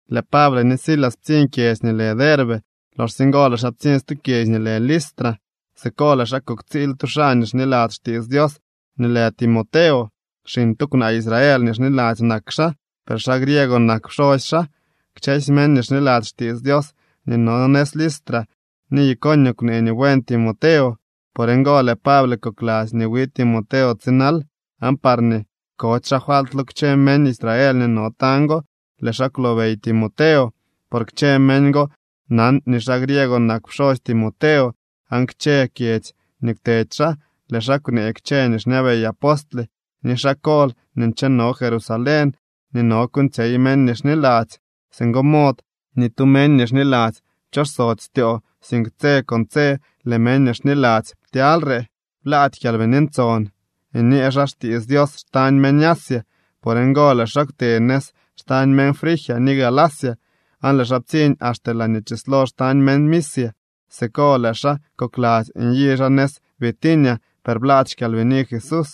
Lëë Pable ni Silas ptsiñ kyedzy nii lë Derbe. Loxsye ngo lëë xaa ptsiñ stu kyedzy nii lë Listra. Siko lëë xaa kuktsiil tu xaa nii xniladzy xtiits Dios nii lë Timoteo. Xiñ tu kwnaa Israel nii xniladzy nak xaa, per xaa griego nak pxosy xaa. Kchësy meñ nii xniladzy xtiits Dios nii no nëz Listra ni Iconio kwnee nii buen Timoteo. Por ngo lëë Pable kokladzy nii wi Timoteo tsinal, aan parñee kody xaa falt lo kchë meñ Israel nii no tañ go, lëë xaa kwlobey Timoteo. Por kchë meñ go nan nii xaa griego nak pxosy Timoteo. Aan kchë kyedzy nii kwtedy xaa, lëë xaa kwnee kchë nii xñabey apostle ni xaa kol nii ncheno Jerusalén nii no kuuñtsyey meñ nii xniladzy. Singo mod ni tu meñ nii xniladzy pchosody styoo, sink tse con tse lëë meñ nii xniladzy ptyalyre. Blaady Kyalbini Ntson nyee xaa xtiits Dios xtañ meñ Asia. Por ngo lëë xaa kwte nëz xtañ meñ Frigia ni Galacia, aan lëë xaa ptsiñ axte laañee chislo xtañ meñ Misia. Siko lëë xaa kokladzy nyi xaa nëz Bitinia, per blaady xKyalbini Jesús.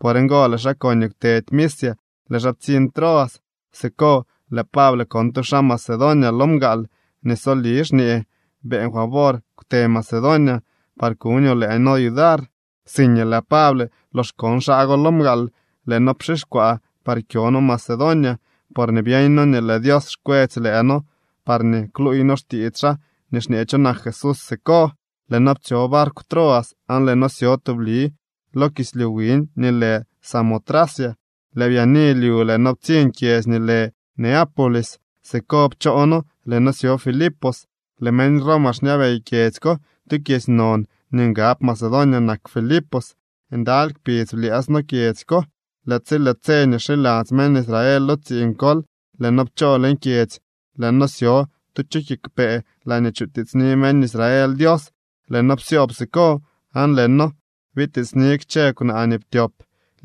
Por ngo lëë xaa koñee kwtedy Misia, lëë xaa ptsiñ Troas. Siko lëë Pable kon tu xaa Macedonia lo mgaal nii soli xñee: “Beeñ favor kwte Macedonia par kuñoo lëë noo yudar.” Siikñee lëë Pable lox kon xaa go lo mgaal, lëë noo pxixkwaa par kyo noo Macedonia, porñee byeeñ noo nii lëë Dios xkwetsy lëë noo parñee kluuy noo xtiits xaa nii xñee cho nak Jesús siko. Lëë noo ptsyo barkw Troas, aan lëë noo syo tubli lo kislyu wiñ nii lë Samotracia. Lëë byaani lyu lëë noo ptsiñ kyedzy nii lë Neápolis. Siko pchoo noo, lëë noo syo Filipos. Lëë meñ Roma xñabey kyedzy ko. Tu kyedzy non nii ngab Macedonia nak Filipos. Ndaly kpidz blyëës noo kyedzy ko. Lëë tsi lëë tse nii xiladzy meñ Israel lo tsiiñ kol, lëë noo pchoo leñ kyedzy, lëë noo syo tu chu kiigwpee laañee chikutiitsni meñ Israel Dios. Lëë noo psyoob siko, aan lëë noo bitiitsni kchë kwnaa nii ptyop.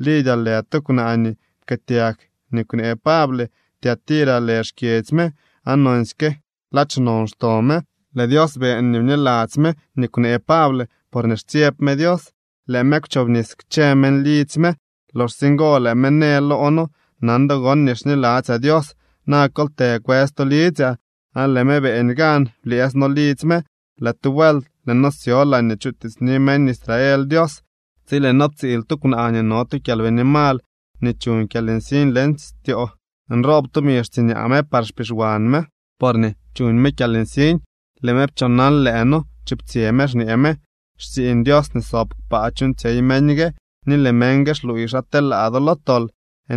Lidia lë tu kwnaa nii pkëëtyag nii kwnee Pable. Tiatira lë xkyedzy me aan nonsyke ladx non xto me. Lëë Dios beeñ nii bniladzy me nii kwnee Pable porñee xtsyeb me Dios. Lëë me kwchobnis kchë meñ lidzy me. Loxsye ngo lëë me në loo noo: —Nan do gon nii xniladzyaa Dios, na kol të kwës to lidzyaa. Aan lëë me beeñ gan, blyëës no lidzy me. Lëë tu vuelt, lëë noo syo laañee chutiitsni meñ Israel Dios, tsi lëë noo ptsiil tu kwnaa nii no tu kyalbini mal nii chuñ kyalnsiñ leñ styoo. Nroob tumi xtsiñaa me par xpixwan me porñee chuñ me kyalnsiñ. Lëë me pchoonal lëë noo, chuptsyë me xñee me: —Xtsiiñ Dios nii sob kpaa chuuñtsyey meñ gue, ni lëë meñ gue xluuy xa telaa do lo tol.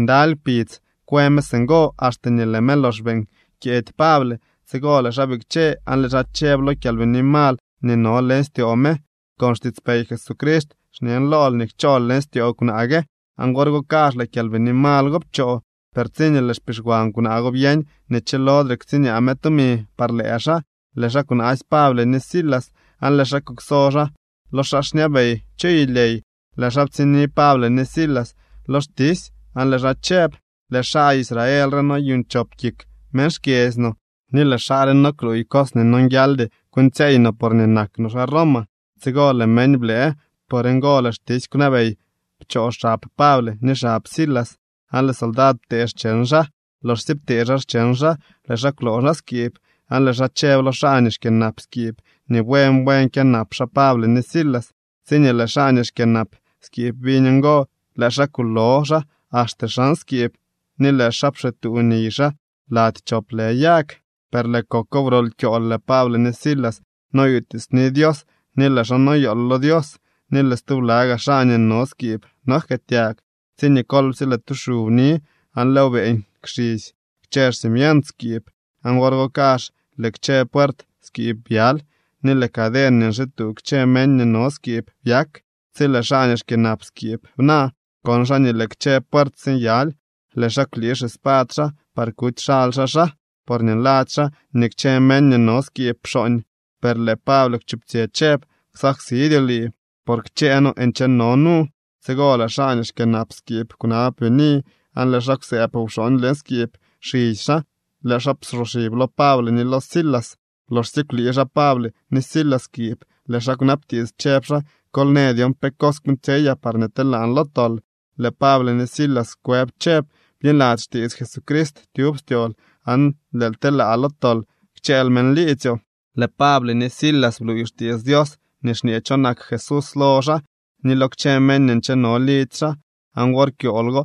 Ndaly kpidz kwë me singo, axte nii lëë me lox beeñ kyeedy Pable. Tsigo lëë xaa bikche aan lëë xaa chëb lo kyalbini mal nii no leñ styoo me: —Con xtiitspey Jesucrist xñen lool nii kchool leñ styoo kwnaa gue. Aan wor go kazh lëë kyalbini mal go pchoo. Per tsiñee lëë xpixwan kwnaa go byeñ nii chilodre ktsiñaa me tumi par lëë xaa, lëë xaa kwnaasy Pable ni Silas aan lëë xaa kukso xaa lo xaa xñabey chu yulyey. Lëë xaa ptsiñni Pable ni Silas lo xtisy aan lëë xaa chëb: —Lëë xaa Israel re noyuuñ chop kik meñ xkyedzy no, ni lëë xaa re no kluuy cos nii nonguialdy kuuñtsyeey no, porñee nak no xaa Roma. Tsigo lëë meñ blëë. Por ngo lëë xtisy kwnabey pchoo xab Pable ni xab Silas aan lëë soldad ptee xcheñ xaa. Loxsye ptee xaa xcheñ xaa, lëë xaa kwloo xaa skiib, aan lëë xaa chëb lo xaa nii xkyënap skiib nii buen buen kyënap xaa Pable ni Silas. Tsiñee lëë xaa nii xkyënap skiib biñ ngo, lëë xaa kulo xaa axte xan skiib ni lëë xaa pxituu niy xaa lady chop lë yag. Per lëë koko wrol kyool, lëë Pable ni Silas noyutiitsni Dios, ni lëë xaa noyool lo Dios, ni lëë stubla gaa xaa nii no skiib nojkëëtyag, tsiñee kolpsye lëë tu xu bni aan lëëw beeñ kxisy kchë xcimient skiib. Aan wor go kazh lëë kchë puert skiib byaly, ni lëë caden nii nxituu kchë meñ nii no skiib byak. Tsi lëë xaa nii xkyënap skiib bna, kon xaa nii lëë kchë puert sinyaly. Lëë xaa kwlii xispad xaa par kuty xaly xaa xaa, porñee nladzy xaa nii kchë meñ nii no skiib pxooñ. Per lëë Pable kwchuptsyë chëb: —Ksaksidyoo lii, por kchësy noo ncheno nu. Tsigo lëë xaa nii xkyënap skiib kwnab bini, aan lëë xaa kwsëëb wxooñ leñ skiib. Xisy xaa, lëë xaa psoxib lo Pable ni lo Silas. Loxsye kwlii xaa Pable ni Silas skiib, lëë xaa kwnabtiits, chëb xaa: —Kol në dyon pe cos kuuñtsyeyaa parñee telaan lo tol. Lëë Pable ni Silas kwëb chëb: —Bniladzy xtiits Jesucrist tyub styool aan lëël telaa lo tol kchëël meñ liidzyoo. Lëë Pable ni Silas bluuy xtiits Dios nii xñee cho nak Jesús lo xaa ni lo kchë meñ nii ncheno lidzy xaa. Aan wor kyool go,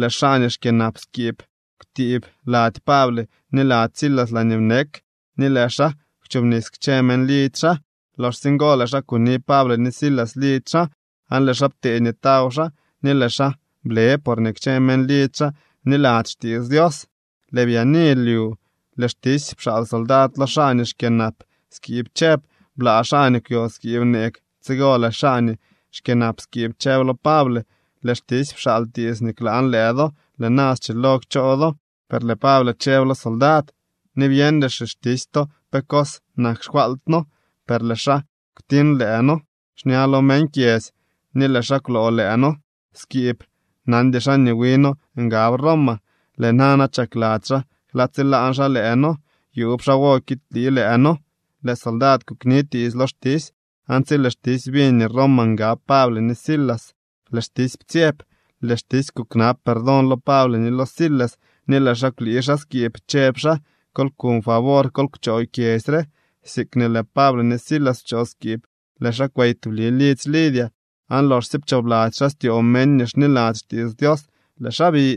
lëë xaa nii xkyënap skiib kwtiib lady Pable ni lady Silas laañee bnek ni lëë xaa kwchobnis kchë meñ lidzy xaa. Loxsye ngo lëë xaa kuni Pable ni Silas lidzy xaa, aan lëë xaa ptee nii taw xaa, ni lëë xaa ble porñee kchë meñ lidzy xaa bniladzy xtiits Dios. Lëë byaani lyu, lëë xtisy pxaal soldad lo xaa nii xkyënap skiib chëb: Blaa xaa nii kwyo skiib neeg. Tsigo lëë xaa nii xkyënap skiib chëb lo Pable: —Lëë xtisy pxaal tiits nii klaan lëë do. Lëë na, schilo kchoo do. Per lëë Pable chëb lo soldad: —Ni byeñdy xixtisy to pe cos nak xfaalt noo, per lëë xaa kwtiñ lëë noo xña lo meñ kyedzy ni lëë xaa kwloo lëë noo skiib. Nandy xaa nii wi noo ngab Roma. ¿Lëë nana chakladzy xaa klaa tsilaan xaa lëë noo? Yuub xaawo kiidlii lëë noo. Lëë soldad kuknitiits lo xtisy, aan tsi lëë xtisy biñ nii Roma ngab Pable ni Silas, lëë xtisy ptsyeb. Lëë xtisy kuknab perdón lo Pable ni lo Silas, ni lëë xaa kwlii xaa skiib chëb xaa: —Kol kuñ favor, kol kchoo kyedzy re. Siikñee lëë Pable ni Silas pchoo skiib, lëë xaa kwey tubli lidzy Lidia, aan loxsye pchoobladzy xaa styoo meñ nii xniladzy xtiits Dios, lëë xaa bi.